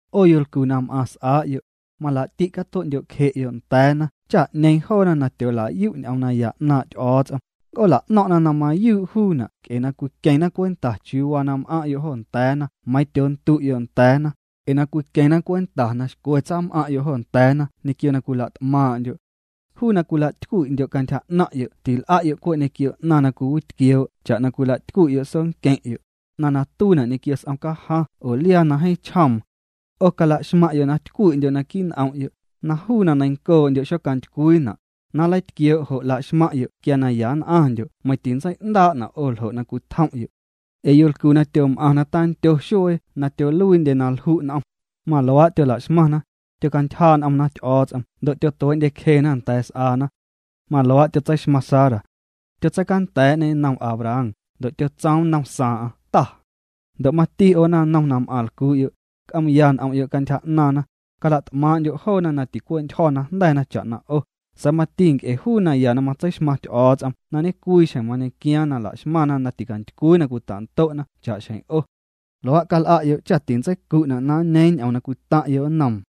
'O yolcu na m'aⁿ s'aa'yo', mala'ti' catue'ndyo'cje'yo' nda̱a̱na cha 'ñeeⁿ joona na tyoola'yu' ñ'oom naya 'naaⁿ' Ty'o̱o̱ts'om, nc'oola'no̱ⁿ'na na mayuu' juuna' nc'e na cwiqueⁿna' cwenta chiuu m'aⁿ'yo' joo nda̱a̱na meiiⁿ tyoondu'yo' nda̱a̱na, ee na cwiqueⁿna cwenta na xcwe tsam'aⁿ'yo' jo nda̱a̱na ñequio na cwila't'maaⁿ'ndyo'. Juu na cwilatycwi'ndyo' cantyja 'naⁿ'yo' til'a'yo' cwe' ñequio 'naⁿ na cwiwitquioo' cha'na cwila'tycwi'yo' soonqueⁿ'yo', 'naⁿ na tuiina' ñequio s'om cajaⁿ oo liaa na jeeⁿ chjoom. 'O calaxmaⁿ'yo' na tycwi'ndyo' naquii' n'om'yo', na juu na neiⁿncoo'ndyo' xocantycwiina', na nleitquioo' jo' laxmaⁿ'yo' quia na ya nn'aⁿndyo' meiⁿ titsei'ndaa'na' 'o ljo' na cwitjom'yo'. Ee yolcu na tyom'aⁿ na tandyo xuee na tyoluiindye na lju' n'om, maluaa' tyola'xmaⁿna, tyocantyjaa' n'omna Ty'o̱o̱ts'om ndo' tyotuee'ndyecjena nda̱a̱ s'aana. Maluaa' tyotseixmaⁿ Sara. Tyotseicanda̱a̱'ñê nnom Abraham, ndo' tsoom nnom saaⁿ'aⁿ Ta. Ndo' mati 'o naⁿnom na m'aⁿ lcuu'yo', c'oom'ya n'om'yo' cantyja 'naaⁿna, cala't'maaⁿ'ndyo' joona na ticwe'ntyjo̱ na jnda̱na cha'na 'o, sa̱a̱ mati nc'e juu naya na matseixmaⁿ Ty'o̱o̱ts'om na ñecwii xjeⁿ mañequiaaⁿ na laxmaⁿna na ticantycwii na cwita'ndo'na cha'xjeⁿ 'o. Luaa' cal'a'yo' cha tintseicu'na' na nñeeⁿ ñ'oom na cwitaⁿ'yo' nnoom.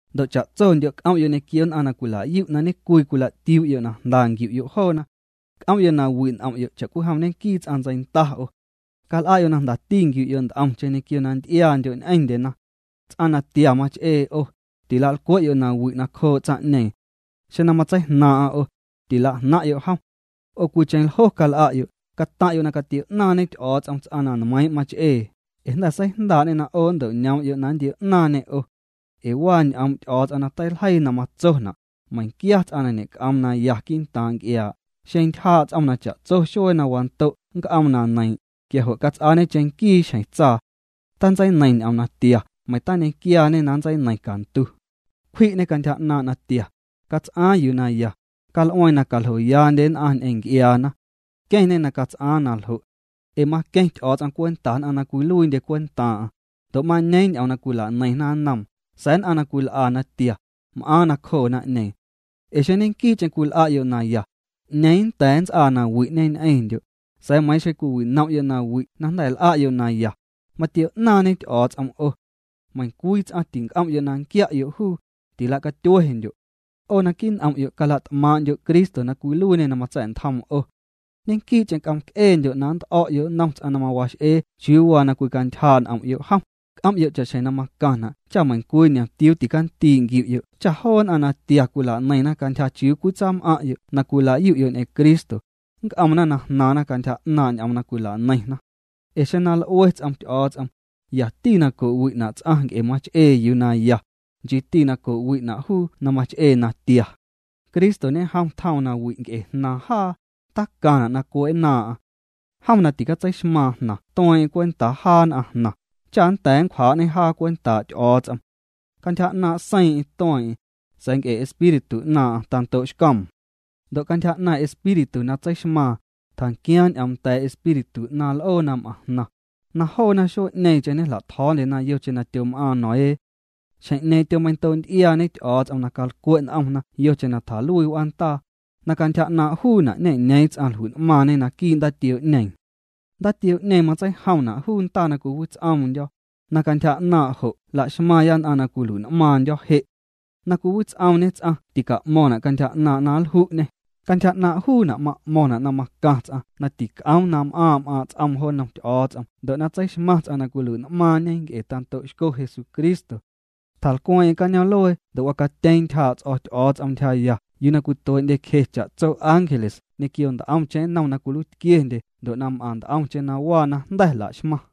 Ndo' cha'tsondyo' c'om'yo' ñequio nn'aⁿ na cwila'yu' na ñecwii cwila'tiuu'yo' na jnda nquiu'yo' joona. C'om'yo' na wi' n'om'yo' cha'cwijom ñenquii ts'aⁿ ntseinda 'o. Cal'a'yo' na jndati nquiu'yo' nt'omcheⁿ ñequio na nty'iaandyo' ñ'eⁿndyena. Ts'aⁿ natia mach'ee 'o, tilalcwe'yo' nawi' nacjoo' tsaⁿ'ñeeⁿ. Xeⁿ na matseijnaaⁿ'aⁿ 'o, 'o tila'jnaⁿ'yo' jom. 'O cwiicheⁿ ljo cal'a'yo', cataⁿ'yo' na catio'naaⁿñe Ty'o̱o̱ts'om ts'aⁿ na nmeiiⁿ' mach'ee, ee jnda̱ seijndaa'ñê na 'o nnto'ñoom'yo' na nntio'ñaaⁿñê 'o. Ee waa ñ'oom' Ty'o̱o̱ts'om na teiljeii na matsona': Meiⁿquia ts'aⁿ na ñe'c'oom na ya quii'ntaaⁿ nc'iaa', xeⁿ ntyjaa' ts'om na cha'tso xuee na wando' nnc'oom na neiiⁿ', quia jo' cats'aañe cheⁿnquii xjeⁿ tsaa. Tantseineiⁿ ñ'oom na tia, meiⁿ tañe'quiaañe na nntseineiⁿ cantu. Cwji'ñê cantyja 'naaⁿ' natia, cats'aaⁿ yuu na ya, cal'ueeⁿ na caljoyaandye nn'aⁿ ñ'eⁿ nc'iaana. Queⁿñê na cats'aaⁿ naljo'. Ee maqueⁿ Ty'o̱o̱ts'om cwenta nn'aⁿ na cwiluiindye cwentaaⁿ'aⁿ, ndo' mañeeⁿ ñ'oom na cwilaneiⁿna nnoom, sa̱a̱ nn'aⁿ na cwil'a natia, m'aaⁿ nacjoo naⁿ'ñeeⁿ. Ee xeⁿ ñequii'cheⁿ cwil'a'yo' na ya, ¿'ñeeⁿ nnda̱a̱ nnts'aa nawi'ñe ñ'eⁿndyo'? Sa̱a̱ meiiⁿ xeⁿ cwiwinom'yo' nawi' na jnda̱ l'a'yo' naya, matio'naaⁿñe Ty'o̱o̱ts'om 'o. Meiⁿ ncwii ts'aⁿ tinc'om'yo' na nquia'yo' juu, tila'catyuendyo'. 'O naquii' n'om'yo' cala't'maaⁿ'ndyo Cristo na cwiluiiñê na matsa̱'ntjoom 'o. Ñequii'cheⁿ c'omc'eendyo' na nt'o̱'yo' nnom ts'aⁿ na mawax'ee chiuu waa na cwicantyjaa' n'om'yo' jom, c'om'yo' cha'xjeⁿ na macaⁿna' cha meiⁿcwii ñomtiuu tacandii' nquiu'yo' cha joo nn'aⁿ na tia cwilaneiⁿna cantyja chiuu cwitsaam'aⁿ'yo' na cwilayu'yo' ñ'eⁿ Cristo, nc'omna na jnaaⁿna cantyja 'naaⁿ' ñ'oom na cwilaneiⁿna. Ee xeⁿ na l'ue ts'om Ty'o̱o̱ts'om, yati na co'wi'na' ts'aⁿ nc'e mach'ee yuu naya, nchiiti na co'wi'na' juu na mach'ee natia. Cristo ñejom tjoom nawi' nc'e jnaaⁿ jaa, tacaⁿna' na cue'nnaaⁿ'aⁿ. Jom na ticatseixmaaⁿ jnaⁿ tueeⁿ'eⁿ cwentaa jaa nn'aⁿ jnaⁿ, cha nnda̱a̱ nncwjaa'ñê jaa cwentaa' Ty'o̱o̱ts'om. Cantyja 'naaⁿ' seiiⁿ'eⁿ tueeⁿ'eⁿ, sa̱a̱ nc'e espíritu 'naaⁿ'aⁿ tando'xcoom. Ndo' cantyja 'naaⁿ' espíritu na tseixmaaⁿ, tjanquiaaⁿ ñ'oom nda̱a̱ espíritu 'naaⁿ l'oo na m'aⁿ jnaⁿ, na joona xuee'ñeeⁿcheⁿ ñejla'tjo̱o̱ndyena yocheⁿ na tyom'aaⁿ Noé. Xjeⁿ'ñeeⁿ tyomeiⁿndoo'nty'iaañe Ty'o̱o̱ts'om na calcwe' n'omna' yocheⁿ na tjaluii w'aandaa, na cantyja 'naaⁿ' juuna' ñe'ñeeⁿ ts'aⁿ jlui'n'maaⁿñe naquii' ndaatioo'ñeeⁿ. Ndaatioo'ñeeⁿ matseijomna' juu ndaa na cwiwits'oomndyo̱, na cantyja 'naaⁿ' jo' laxmaaⁿya nn'aⁿ na cwilui'n'maaⁿndyo̱ je'. Na cwiwits'oomñe ts'aⁿ tica'mo̱ⁿna' cantyja 'naaⁿ' na nlju'ñê, cantyja 'naaⁿ' juuna' ma'mo̱ⁿna' na macaⁿ ts'aⁿ na tic'oom na m'aaⁿ' m'aaⁿ' ts'oom jo nnom Ty'o̱o̱ts'om ndo' na tseixmaⁿ ts'aⁿ na cwilui'n'maaⁿñe nc'e na tando'xco Jesucristo. Tjalcweeⁿ'eⁿ cañoom'luee ndo' wacatyeeⁿ ntyjaa' ts'o̱ Ty'o̱o̱ts'om ntyjaya yuu cwituee'ndyecje cha'tso ángeles ñequio nt'omcheⁿ nnom na cwiluiitquiendye ndo' m'aⁿ nt'omcheⁿ na waa na jnda̱ la'xmaⁿ.